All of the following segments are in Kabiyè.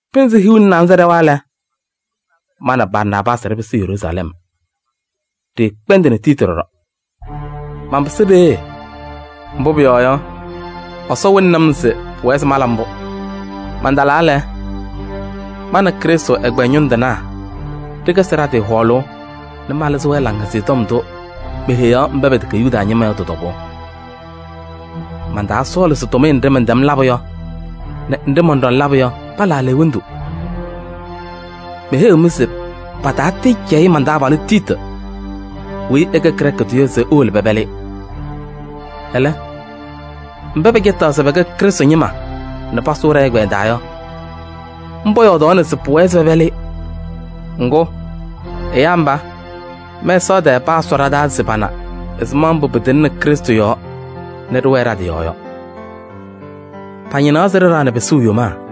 Pɩnzɩ hiu nɛ naanza ɖɛwa lɛ, ma nɛ Barnaabaasɩ ɖɩpɩsɩ Yeruusalɛm. Ɖɩɩkpɛndɩnɩ Tiiti ɖɔɖɔ. Manpɩsɩ peeye, mbʋ pʋyɔɔ yɔ, Ɛsɔ wɩlɩnɩ-m se pʋwɛ se mala mbʋ. Mantalaa lɛ, ma nɛ Krɩstʋ ɛgbɛyɛ ñʋŋ tɩnaa ɖɩkɛzɩ ɖa-tɩ hɔɔlʋʋ nɛ malɩzɩ-wɛ Laŋhɛzɩyɛ Tɔm ndʋ meheyaɣ mba pɛtɛkɛ Yuda ñɩma yɔ, tɩ-tɔbʋʋ. Mantaasɔɔlɩ se tʋmɩyɛ nɖɩ mɛntɛm labʋ yɔ nɛ nɖɩ mɔnɖɔŋ labʋ yɔ pala aleɣwondu. Meheyiɣ-mɩ se paataatɩɩcɛyɩ man-taabalʋ Tiiti weyi ɛkɛ Grɛɛkɩ tʋ yɔ se ewolo pɛpɛlɩ-ɩ. Ɛlɛ, mba pɛcɛtaɣ se pɛkɛ Krɩstʋ ñɩma nɛ paasʋ ɖɛ-ɛgbɛyɛ taa yɔ, mba yɔɔdaɣna se pʋwɛɛ se pɛpɛlɩ-ɩ. Ŋgʋ, ɛyaa mba, mɛsaɣ tɛɛ paasʋ ɖa-taa se pana ɛzɩma mbʋ pɩtɩŋnɩ Krɩstʋ Yesu yɔɔ nɛ ɖɩwɛɛ ɖa-tɩ yɔɔ yɔ. Pañɩnaɣ se ɖɩɖaɣnɩ pɩsʋʋ yomaa.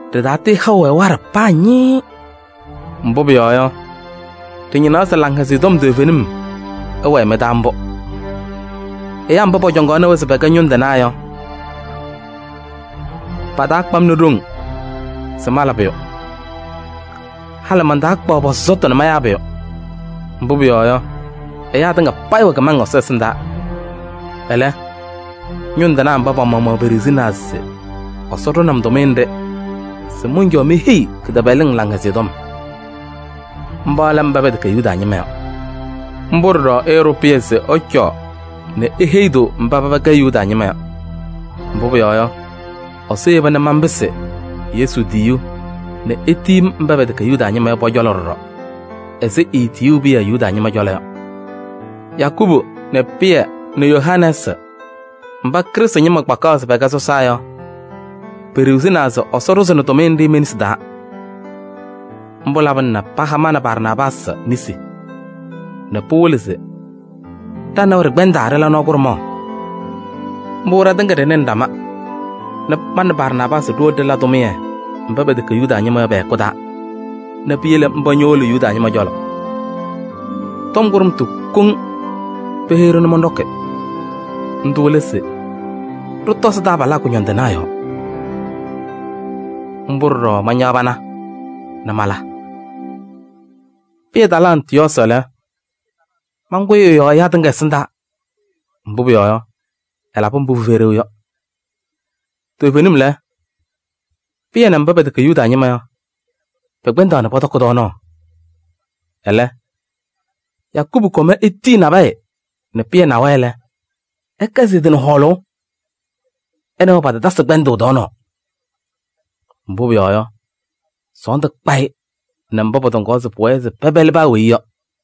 Ɖɩtatɩɩhaʋ-wɛ waɖɛ paa ñɩɩɩ. Mbʋ pʋyɔɔ yɔ, ɖɩñɩnaɣ se Laŋhɛzɩyɛ Tɔm toovenim ɛwɛɛ mɩ-taa mbʋ. Ɛyaa mba pɔcɔŋaɣnɩ-wɛ se pɛkɛ ñʋŋ tɩnaa yɔ, patakpa-m nɛ ɖoŋ se mala pʋyʋ. Halɩ mantakpaɣ pɔ-sɔsɔtʋ nɛ mayaa pʋyʋ. Mbʋ pʋyɔɔ yɔ, ɛyaa tɩŋa payɩ wɛ kɩmaŋ Ɛsɔ ɛsɩndaa. Ɛlɛ, ñʋŋ tɩnaa mba pa-maɣmaɣ peɖiɣzinaa se Ɛsɔ ɖʋnɩ-m tʋmɩyɛ nɖɩ se mɔncɔɔ meheyi kɩtɛpɛlɩŋ Laŋhɛzɩyɛ Tɔm: mba lɛ mba pɛtɛkɛ Yuda ñɩma yɔ. Mbʋ ɖɔɖɔ ɛɛɖʋ Pɩyɛ se ɛcɔɔ nɛ eheyi-tʋ mba paba kɛ Yuda ñɩma yɔ. Mbʋ pʋyɔɔ yɔ, Ɛsɔ yeba nɛ manpɩsɩ Yesu tiyiyu nɛ etiyi-m mba pɛtɛkɛ Yuda ñɩma yɔ pɔ-cɔlɔ ɖɔɖɔ ɛzɩ etiyuu Pɩyɛ Yuda ñɩma cɔlɔ yɔ. Yakubu nɛ Pɩyɛ nɛ Yohanɛɛsɩ mba Krɩstʋ ñɩma kpakaɣ se pɛkɛ sɔsaa yɔ, peɖiɣzinaa se Ɛsɔ ɖʋzɩnɩ tʋmɩyɛ nɖɩ me-nesi taa. Mbʋ labɩna nɛ paha ma nɛ Barnaabaasɩ nesi nɛ pɩwɩlɩ se ɖa nɛ wɛ ɖɩkpɛndaa ɖɩla nɔɔ kʋɖʋmaɣ. Mbʋ ɖatɩŋa ɖɩnɩnɩ ɖama nɛ ma nɛ Barnaabaasɩ ɖiwolo ɖɩla tʋmɩyɛ mba pɛtɛkɛ Yuda ñɩma yɔ pɛ-hɛkʋ taa nɛ piyele mba ñowolo Yuda ñɩma cɔlɔ. Tɔm kʋɖʋmtʋ koŋ peheyi-ɖʋ nɛ mɔnɖɔkɩ. Ndʋ lɛ se ɖɩtɔzɩ taabalaa kʋñɔndɩnaa yɔɔ. Mbʋ ɖɔɖɔ mañaɣ pana nɛ mala. Pɩyɛ talɩ Antɩyɔɔsɩ lɛ, mankʋyɩ ɛ-yɔɔ ɛyaa tɩŋa ɛsɩndaa, mbʋ pʋyɔɔ yɔ, ɛlabɩ mbʋ pɩfɛyɩ ɖeu yɔ. Toovenim lɛ, Pɩyɛ nɛ mba pɛtɛkɛ Yuda ñɩma yɔ, pɛkpɛndaɣ nɛ pɔtɔkɩ tɔɔnaɣ. Ɛlɛ, Yakubu kɔm etiyi nabɛyɛ nɛ Pɩyɛ na-wɛ lɛ, ɛkɛzɩ ɛ-tɩ nɛ hɔɔlʋʋ. Ɛ nɛ wɛ patatasɩ kpɛndʋʋ tɔɔnaɣ, mbʋ pʋyɔɔ yɔ, sɔɔndʋ kpa-ɩ nɛ mba pɔtɔŋaɣ se pɩwɛɛ se pɛpɛlɩ paa weyi yɔ.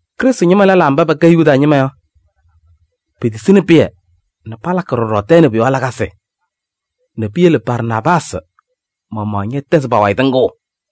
Krɩstʋ ñɩma lɛlaa mba pɛkɛ Yuda ñɩma yɔ, petisini Pɩyɛ nɛ palakɩ ɖɔɖɔ tɛɛ nɛ pʋ-yɔɔ lakasɩ nɛ piyele Barnaabaasɩ maɣmaɣ ñɛtɛzɩ pa-wayɩ tɩŋʋʋ.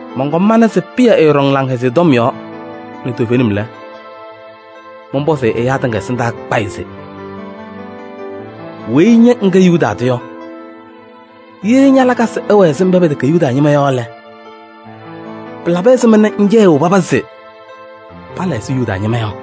Mɔnkɔm mana se Pɩyɛ ɛɛɖɔŋ Laŋhɛzɩyɛ Tɔm yɔɔ nɛ toovenim lɛ, mɔnpɔzɩ-ɩ ɛyaa tɩŋa ɛsɩndaa kpayɩ se: “Weyi ña ŋkɛ Yuda tʋ yɔ, ye ña-lakasɩ ɛwɛ ɛzɩ mba pɛtɛkɛ Yuda ñɩma yɔ lɛ, pɩlabɩ ɛzɩma nɛ ŋcɛyɩɣ paba se pala ɛzɩ Yuda ñɩma yɔ?”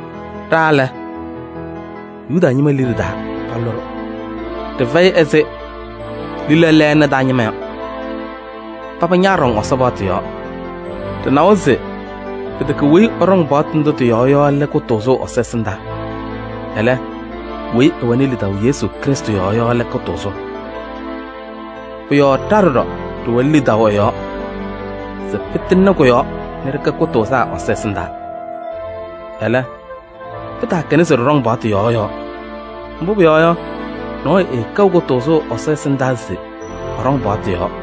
Ɖa lɛ, Yuda ñɩma liɖe taa palʋlɩ-ɖʋ. Ɖɩfɛyɩ ɛzɩ lila lɛɛna taa ñɩma. Paba ñaaɖɔŋ Ɛsɔ paɣtʋ yɔɔ. Ɖɩnawa se pɩtɛkɛ weyi ɛɖɔŋ paɣtʋ ndʋ tɩ-yɔɔ yɔ lɛ kʋtʋʋzʋ Ɛsɔ ɛsɩndaa. Ɛlɛ, weyi ɛwɛnɩ lidaʋ Krɩstʋ Yesu yɔɔ yɔ lɛ kʋtʋʋzʋ. Pʋ-yɔɔ ɖa ɖɔɖɔ ɖɩwɛnɩ lidaʋ ɛ-yɔɔ se pɩtɩŋnɩ kʋ-yɔɔ nɛ ɖɩkɛ kʋtʋʋzaa Ɛsɔ ɛsɩndaa. Ɛlɛ, pɩtaakɛna se ɖɩɖɔŋ paɣtʋ yɔɔ yɔɔ. Mbʋ pʋyɔɔ yɔ, nɔɔyʋ ɛɛkɛɣ kʋtʋʋzʋ Ɛsɔ ɛsɩndaa se ɛɖɔŋ ɛ-paɣtʋ yɔɔ.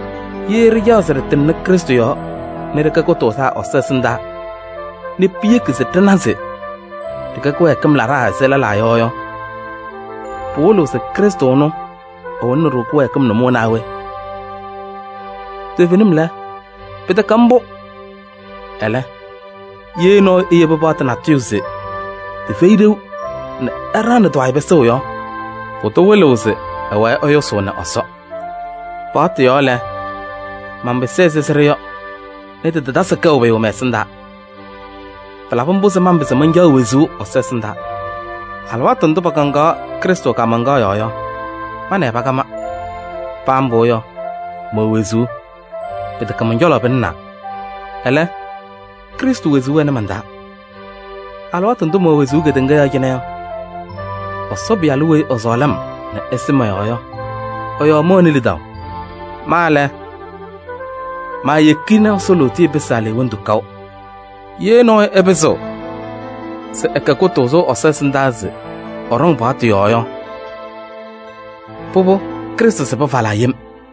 Ye ɖɩcaɣ se ɖɩtɩŋnɩ Krɩstʋ yɔɔ nɛ ɖɩkɛ kʋtʋʋzaa Ɛsɔ ɛsɩndaa nɛ piyeki se ɖɩna se ɖɩkɛ kɩwɛɛkɩm laɖaa ɛzɩ lɛlaa yɔ yɔ, pɩwɩlɩɣ se Krɩstʋ ɛnʋ ɛwɩlɩɣnɩ-ɖʋ kɩwɛɛkɩm nʋmɔʋ naa we? Toovenim lɛ, pɩtɛkɛ mbʋ! Ɛlɛ, ye nɔɔyʋ eyebi paɣtʋ natʋyʋ se tɩfɛyɩ ɖeu nɛ ɛɖaɣnɩ tɩ-wayɩ pɩsʋʋ yɔ, pʋdʋ wɩlɩɣ se ɛwɛɛ ɛyʋsʋʋnɩ Ɛsɔ. Paɣtʋ yɔɔ lɛ, manpɩsɩ ɛzɩ sɩɖʋ yɔ nɛ tɩtatasɩ kɛʋ pʋyʋ mɛ-ɛsɩndaa. Pɩlabɩ mbʋ se manpɩzɩ mancaɣ wezuu Ɛsɔ ɛsɩndaa. Alɩwaatʋ ndʋ pakaŋaɣ Krɩstʋ kaamaŋkaɣ yɔɔ yɔ, ma nɛ ɩ pakama. Paa mbʋ yɔ, mɛwɛ wezuu. Pɩtɛkɛ mɔn-cɔlɔ pɩlɩnaa, ɛlɛ, Krɩstʋ wezuu wɛnɩ man-taa. Alɩwaatʋ ndʋ mɛwɛ wezuu kedeŋa yɔɔ cɩnɛ yɔ, Ɛsɔ Pɩyalʋ weyi ɛsɔɔlɩ-m nɛ ɛsɩ mɔ-yɔɔ yɔ ɛ-yɔɔ mɛwɛnɩ lidaʋ. Ma lɛ, maayeki nɛ Ɛsɔ lootiye pɩsɩ aleɣwondu kaʋ. Ye nɔɔyʋ ɛpɩzɩɣ ɛkɛ kʋtʋʋzʋ Ɛsɔ ɛsɩndaa se ɛɖɔŋ paɣtʋ yɔɔ yɔ, pʋbʋ Krɩstʋ sɩbɩ falaa yem.